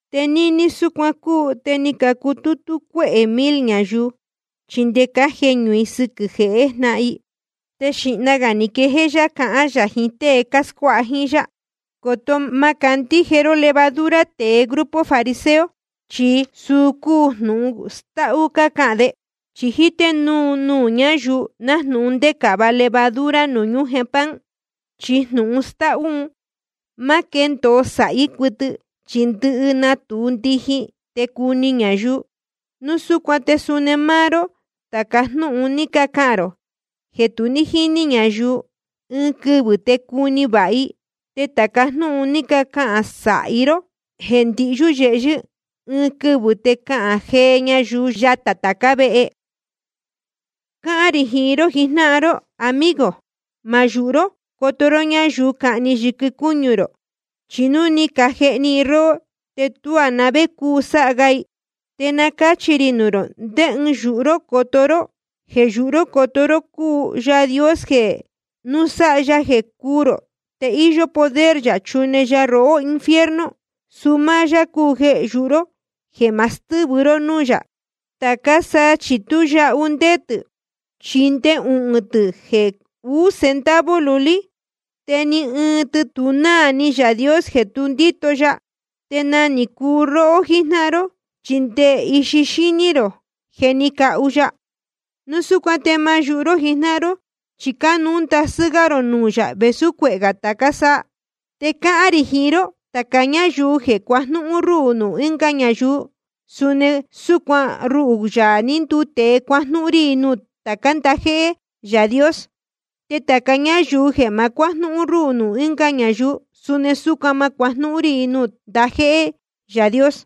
Te níní súcuan cúu, te ni cacutútú cuéhē mil ñayuu, chi nde cájeñū i sɨquɨ̄ jehé jnáhan i. Te xīhna gā ni quejéé yá cahán yā jiín tée cáscuáha jíín yá: Coto má candíje ró levadura tēe grupo fariseo, chi suu cúu jnūhun stáhú cácahān de. Chi jíté núu nuū ñáyuu, nájnūhun ndécava levadura nuū ñújen pan. Chi jnūhun stáhú un má quéndōo sāhí cuɨtɨ, chi ndɨhɨ natūu ndijin, te cuni ñayuu. Núu súcuan te suni máá ró, tāca jnúhun ni cacahān rō jeē tu ní jíní ñayuu, ɨɨn quɨvɨ̄ te cuni vāha i. Te tāca jnúhun ni cacahān sāhi ró jeē ndihyú yehyɨ́, ɨɨn quɨvɨ̄ te cahān jee ñayuu yatā tācá vehe. ’Cáhán rī jiín ró jijnáhan ró, amigo: Ma yūhu ró coto ró ñáyuu cahni yɨquɨ cúñu rō, chi núu ni cajehni i róhó, te tuá na vé cúu sáha ga i. Te na cáchi rī nuū rō ndé ɨɨn yūhu ró coto ró: Jeē yūhu ró coto ró cúu Yaā Dios jeē núu sáha ya jeē cúū rō, te íyó poder yā chune ya rohó infierno. Suu máá yá cúu jeē yūhu ró jeē ma stɨ́vɨ ró nuū yā. ’Te tācá saa chi tú yahu ndéé tɨ̄, chi nde uhūn tɨ̄ jeē uú centavo lulí. Te ni ɨɨn tɨ tu náā ni Yaā Dios jeē tu ndíto ya. Te nagā ni cuu róhó jíjnáhan ró, chi nde ndɨhɨ ixi xíní rō je ni cahu ya. Núu súcuan te ma yūhu ró jijnáhan ró, chi cánuú ndasɨ́ gá rō nuū yā vēsú cuehē tācá saa. ’Te cáhán rī jiín ró, tāca ñáyuu jeē cuajnúhún rúhū nuū ɨnga ñayuu, suni súcuan ruhū, Yaā ní nduu tēe, cuajnúhún rí i nuū tācá ndajéhé Yaā Dios. Te tāca ñáyuu jeē ma cuájnúhún rúhū nuū ɨnga ñayuu, suni súcuan ma cuájnúhún rí i nuū tācá ndajéhé Yaā Dios.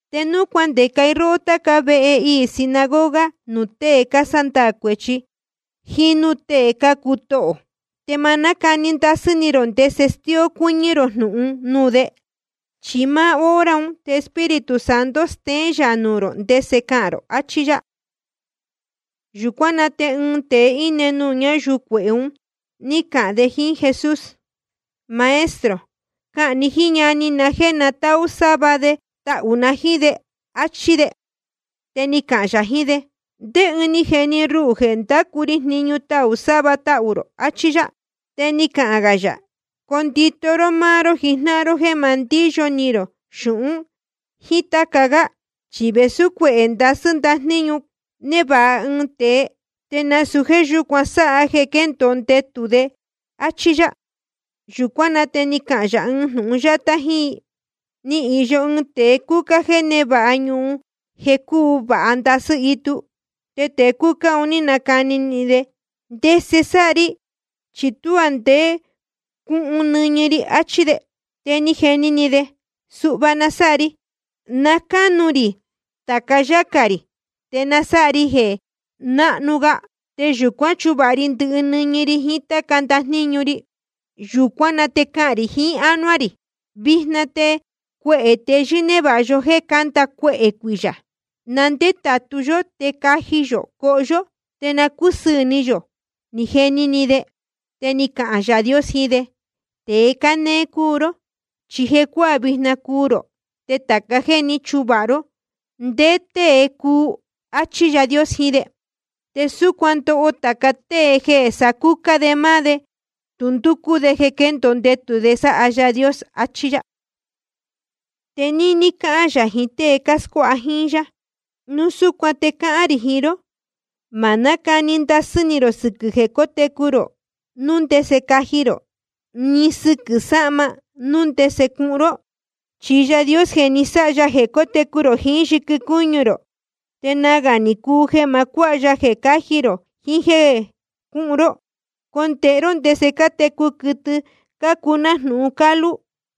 ’Te núu cuandeca i róhó táca vehe iī sinagoga nuū tée cásándaā cuēchi, jíín núū tée cácuu tohō, te ma nácani ndasɨ́ ni rō ndese stíó cuɨ́ñɨ́ rō jnūhun nuū de. Chi máá hora un te Espíritu Santo steén yā nuū rō ndese cahān rō. Achí yá. Yūcuán na te ɨɨn tēe íne nuū ñáyuu cuehē un ní cahān de jíín Jesús: Maestro, cahān ni jíín ñani na jéē na táhú sáva de tahū na jíín de, áchí de. Te ni cahān yā jiín de: ¿Ndé ɨɨn ni jeni ruhū jeē ndacu ri jniñu tahū sáva tahū rō? Achí yá. Te ni cahān gā yā: Condito ró máá ró jijnáhan ró jéē ma ndíyo ni rō xūhun jíín táca gá. Chi vēsú cuehē ndasɨ́ ndajníñu névāha ɨɨn tēe, te nasūu jéē yúcuan sáha jeē quéndōo ndetū de, áchí yá. Yūcuán na te ni cahān yā ɨɨn jnūhun yátá jíín i: Ni īyo ɨɨn tēe cúcá jeē névāha ñuhun jeē cúu vāha ndasɨ́ itu. Te tēe cúcá un ní nacani ni de: ¿Ndese sáha ri? Chi tuá ndé cuhun nɨñɨ ri. Achí de. Te ni jeni ni de: Suhva na sáha ri. Na cánu rī tāca yácā rī, te nasáha ri jeē náhnu ga. Te yūcuán chuvāha ndɨhɨ ri nɨñɨ ri jiín táca ndajníñu ri. Yūcuán na te cahān rī jiín ánuá rī: Vijna te cuehē teyɨ́ névāha yó jéē canda cuehē cuiyā. Na ndétātu yó te caji yō coho yó, te na cúsɨɨ̄ ni yō, ni jeni ni de. Te ni cahān Yaā Dios jiín de: Tēe cánéé cúu ró. Chi jecuáā vijna cuu rō, te tāca jéē ní chuvāha ró, ¿ndé tée cuu? Achí Yaā Dios jiín de. Te súcuan ndoho tāca tée jeē sacúcá de máá de, te tu ndúcú de jeē quendōo ndetū de sáha Yaā Dios. Achí yá. Te ni cahān yā jiín tée cáscuáha jíín yá: Núu súcuan te cáhán rī jiín ró: Ma nácani ndasɨ́ ni rō sɨquɨ̄ jeē cótecu rō, núu ndese caji rō, ni sɨquɨ̄ sahma, núu ndese cuhun ró. Chi Yaā Dios ni sáha ya jeē técu rō jiín yɨquɨ cúñu rō, te nagā ni cuu jeē ma cuáha ya jeē cáji rō jiín jéē cúhun ró. Condēhe ró ndese cátecu quɨtɨ cácuu nájnūhun cálú,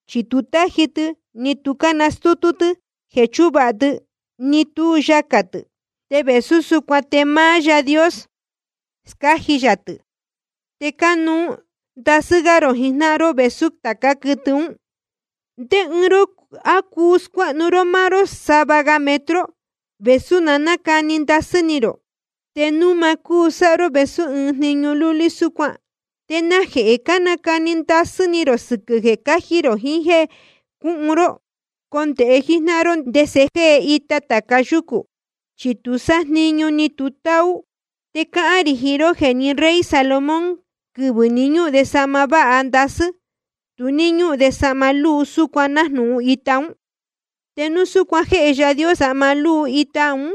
chi tu cátaji tɨ, ni tu cánastútú tɨ́ jeē chúvāha tɨ, ni tú yacā tɨ̄. Te vēsú súcuan te máá Yaā Dios scáji yā tɨ̄. Te cánuú ndasɨ́ gá rō jijnáhan ró vēsú tācá quɨtɨ ún. ¿Te ndé ɨɨn ró, á cuu scuéhnu ró máá ró sava metro gā, vēsú na nácani ndasɨ́ ni rō? Te núu ma cúu sáha ró vēsú ɨɨn jniñu lúlí súcuan, ¿te najehē cánacani ndasɨ́ ni rō sɨquɨ̄ jeē cáji rō jiín jéē cuhun ró? ’Condēhe jíjnáhan ró ndese jée ita tāca yúcū. Chi tu sájniñu, ni tu táú. Te cáhán rī jiín ró jeē ni rey Salomón, quɨvɨ̄ ní ñúhun de sahma váha ndasɨ́, tu ní ñúhun de sahma lúu súcuan nájnūhun ita ún. Te núu súcuan jéhe Yaā Dios sahma lúu ita un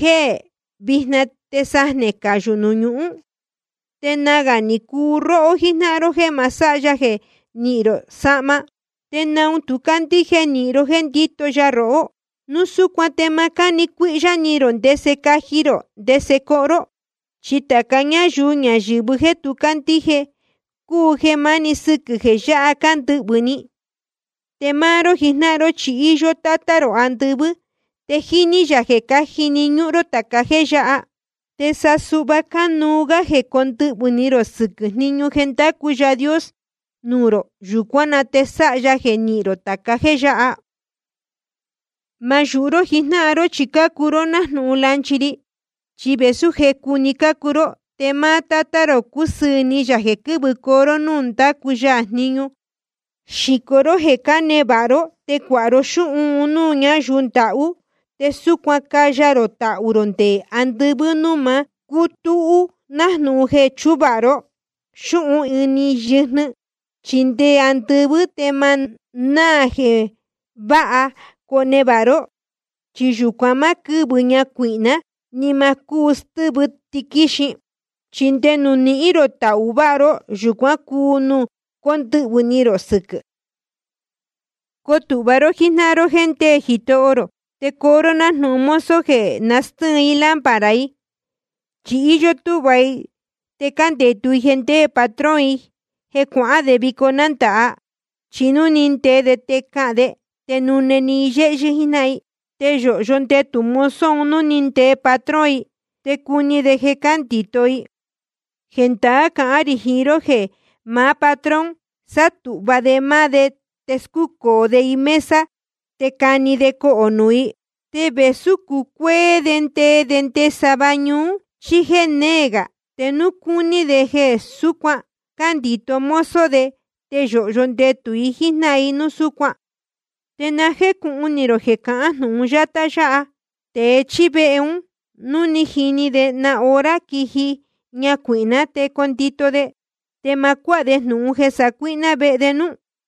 jéē jée vijna te sajnē cayū nuū ñuhún, te nagā ni cuu róhó jíjnáhan ró jéē ma sáha ya jeē nihín rō sahma. ¿Te naun tu cácandíje nīhin ró jéē ndíto ya rohó? Núu súcuan te ma nácani cuíhyá ni rō ndese caji rō ndese coho ró. Chi tāca ñáyuu ñayɨ̄vɨ jéē tu cácandíje cúu jeē máni sɨquɨ̄ jeē yáha cándɨhvɨ̄ ni i. Te máá ró jijnáhan ró, chi íyó Tátá rō andɨvɨ́, te jíní yā jeē cájini ñúhún ró tāca jéē yáha. Te sa suhva cánuú gá jeē cóndɨhvɨ̄ ni rō sɨquɨ̄ jniñu jeē ndácu Yaā Dios nuū rō. Yūcuán na te sáha ya jeē nihín rō tāca jéē yáha. ’Ma yūhu ró jijnáhan ró chi cácuu ró nájnūhun lanchi ri. Chi vēsú jecu‑ni cácuu ró, te máá Tátá rō cúsɨɨ̄ ni yā jeē quɨ́vɨcoo ró ñuu nuū ndácu ya jniñu. Xīco ró jeē cánevāha ró, te cuāha ró xúhun un núū ñáyuu ndahú. Te súcuan caya rō tahū rō nde andɨvɨ́ núū ma cútúhú, nájnūhun jeē chúvāha ró xúhun ini yɨjnɨ. Chi nde andɨvɨ́ te ma náā jeē váha conevāha ró. Chi yūcuan má quɨ́vɨ ñacuīhná, ni ma cúu stɨ́vɨ tiquíxin. Chi nde nuū nihín rō tahū váha ró, yūcuan cúu nuū cóndɨhvɨ̄ ni rō sɨquɨ̄. ’Coo tūhva ró jíjnáhan ró jéē ndéē Jitoho rō, te coo ró nájnūhun mozo jeē nastɨ́ɨn i lámpara i. Chi íyó túhva i te cándetu i jeē ndéē patrón i jeē cuahán de vico nándāha. Chi núu ni ndee de te cahān de, te nune‑ni i yéhyɨ́ jíjnáhan i. Te yōhyo ndetū mozo un núu ni ndee patrón i, te cuni de jeē cándito i. Jendaá cahán rī jiín ró jeē maá patrón sátūhva de máá de, te scúcōo de i mesa te cani de cohō i. Te vēsú cucuéé de ndee de nde sava ñuú, chí jéē néē gā, te núu cuni de jeē súcuan cándito mozo de, te yōhyo ndetū i jíjnáhan i núu súcuan. Te na jécūhun ni rō jeē cahán jnūhun yátá yáha: Tēe chíí vehe, núu ni jini de na hora quiji ñacuīhná, te condito de, te ma cuáha de jnūhun jeē sacuíhná vehe de núú.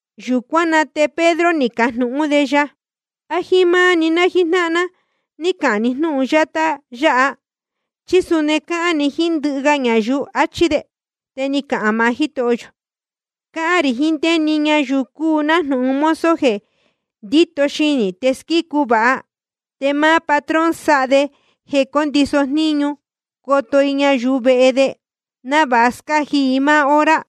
Yūcuán na te Pedro ni cajnūhún de ya: ¿A jíín máá‑ni ná jíjnáhan ná cáhán ni jnúhun yátá yáha, chí suni cáhán ni jíín ndɨhɨ ga ñayuu? achí de. Te ni cahān maá Jítoho yō: Cáhán rī jiín ndé‑ni ñayuu cúu nájnūhun mozo jeē ndito xinī te squícu vāha. Te máá patrón sáha de jeē condiso jníñu i coto i ñayuu vehe de, návāha scáji i máá hora.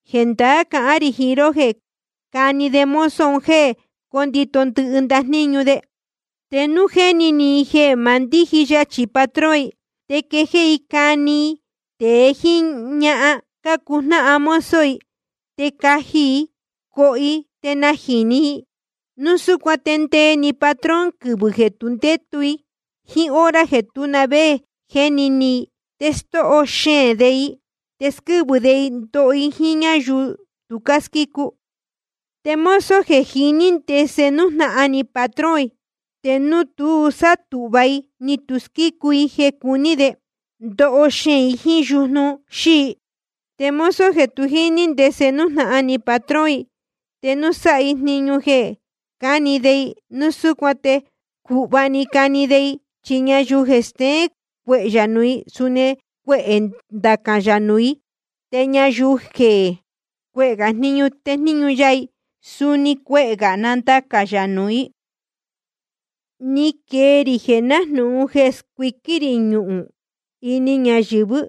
Jendaá cahán rī jiín ró jeē cani de mozo un jéē cóto i ndɨhɨ ndajníñu de. Te núu jéni ni i jeē ma ndíji yachī patrón i, te quejéé i cani i tēe jíín ñahan cácuu jnáhan mozo i, te caji i coho i te najīni i, núu súcuan te ndee‑ni patrón quɨvɨ̄ jeē tu ndétu i jíín hora jeē tú na vé jéni ni i. Te stóho xeēn de i, te squɨ́vɨ de i ndoho i jíín ñáyuu tu cásquícu. ’Te mozo jeē jiní i ndese nújnahan ni patrón i, te núu tu sátūhva i ni tu squícu i jeē cuní de, ndoho xeēn i jíín yujnu xíi. Te mozo jeē tu jíní i ndese nújnahan ni patrón i, te núu sáha i jniñu jeē cani de i, núu súcuan te cūhva‑ni cani de i. Chi ñayuu jeē steén cuehē yā nuū i, suni cuehē nandacān yā nuū i. Te ñayuu jeē cuehē gā jniñu téjníñu ya i, suni cuehē gā nandacān yā nuū i. ’Ni quee rī jeē nájnūhun jeē scuiquín rī ñuhūn ini ñayɨ̄vɨ́,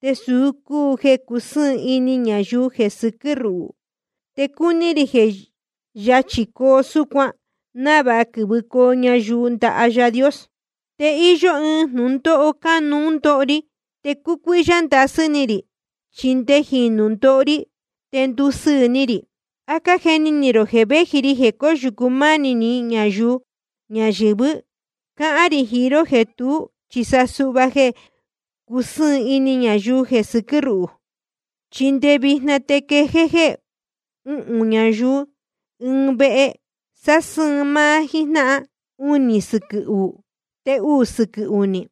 te suu cúu jeē cusɨ́ɨn ini ñayuu jeē sɨquɨ́ ruhū. Te cúní rī jeē yachī coo súcuan, návāha quɨ̄vɨcoo ñayuu ndaha Yaā Dios. Te íyó ɨɨn jnūndóho cánuú ndoho ri, te cúcuíhyá ndasɨ́ ni rī chi nde jīnu ndoho ri, te ndusɨɨ̄ ni rī. ¿A cájeni ni rō jeē véji ri jeē cóyūcu mánī ñayuu ñayɨ̄vɨ́? Cáhán rī jiín ró jeē tuú, chi sa suhva jeē cusɨ́ɨn ini ñayuu jeē sɨquɨ́ ruhū. Chi nde vijna te quejéé jéē uhūn ñayuu ɨɨn vehe, sásɨ́ɨn máá jíjnáhan, unī sɨquɨ̄ uú, te uū sɨquɨ̄ uní.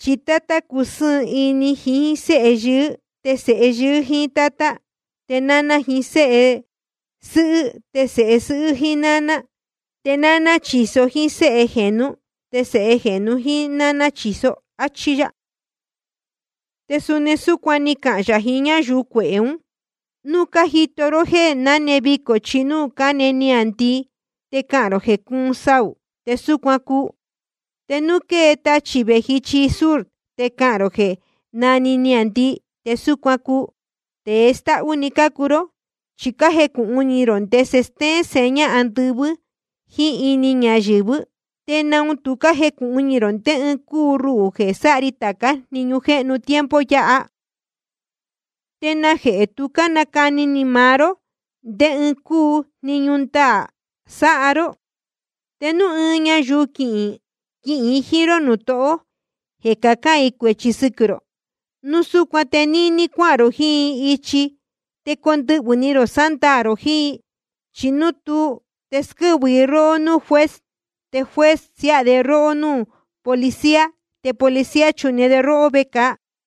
Chi tátá cusɨ́ɨn ini jiín séhe yɨɨ́, te sēhe yɨɨ́ jíín tátá, te náná jiín séhe sɨ́hɨ́, te sēhe sɨ́hɨ́ jíín náná, te náná chīso jíín séhe jēnú, te sēhe jēnu jíín náná chīso. Achí yá. Te suni ni cahān yā jiín ñáyuu cuehē ún: Núu cájito ró jeē náne vicō ichi núū cáne niāndii, te cácahān rō jeē cuun saū, te súcuan cúu. Te núu quée tachī vēji ichi sur te cácahān rō jeē nandii, te súcuan cúu. Tēe stáhú‑ni cácuu ró. Chi cájecūhun ni rō ndese stéén seña andɨvɨ́ jíín ini ñayɨ̄vɨ́, ¿te naun tu cájecūhun ni rō ndé ɨɨn cúu ruhū jeē sáha ri tācá jniñu jéhnu tiempo yáha? ’¿Te najehē tu cánacani ni maá ró ndé ɨɨn cúu jniñu ndaā sáha ró? Te núu ɨɨn ñayuu quihīn i jíín ró nuū tohó jeē cacán i cuēchi sɨquɨ̄ rō, núu súcuan te níní cuáhān rō jiín i ichi te condɨhvɨ̄ ni rō sándaā rō jiín i. Chi núu tuú, te squɨ́vɨ i róhó núū juez, te juez siáha de róhó núū policía, te policía chune de róhó vecāa.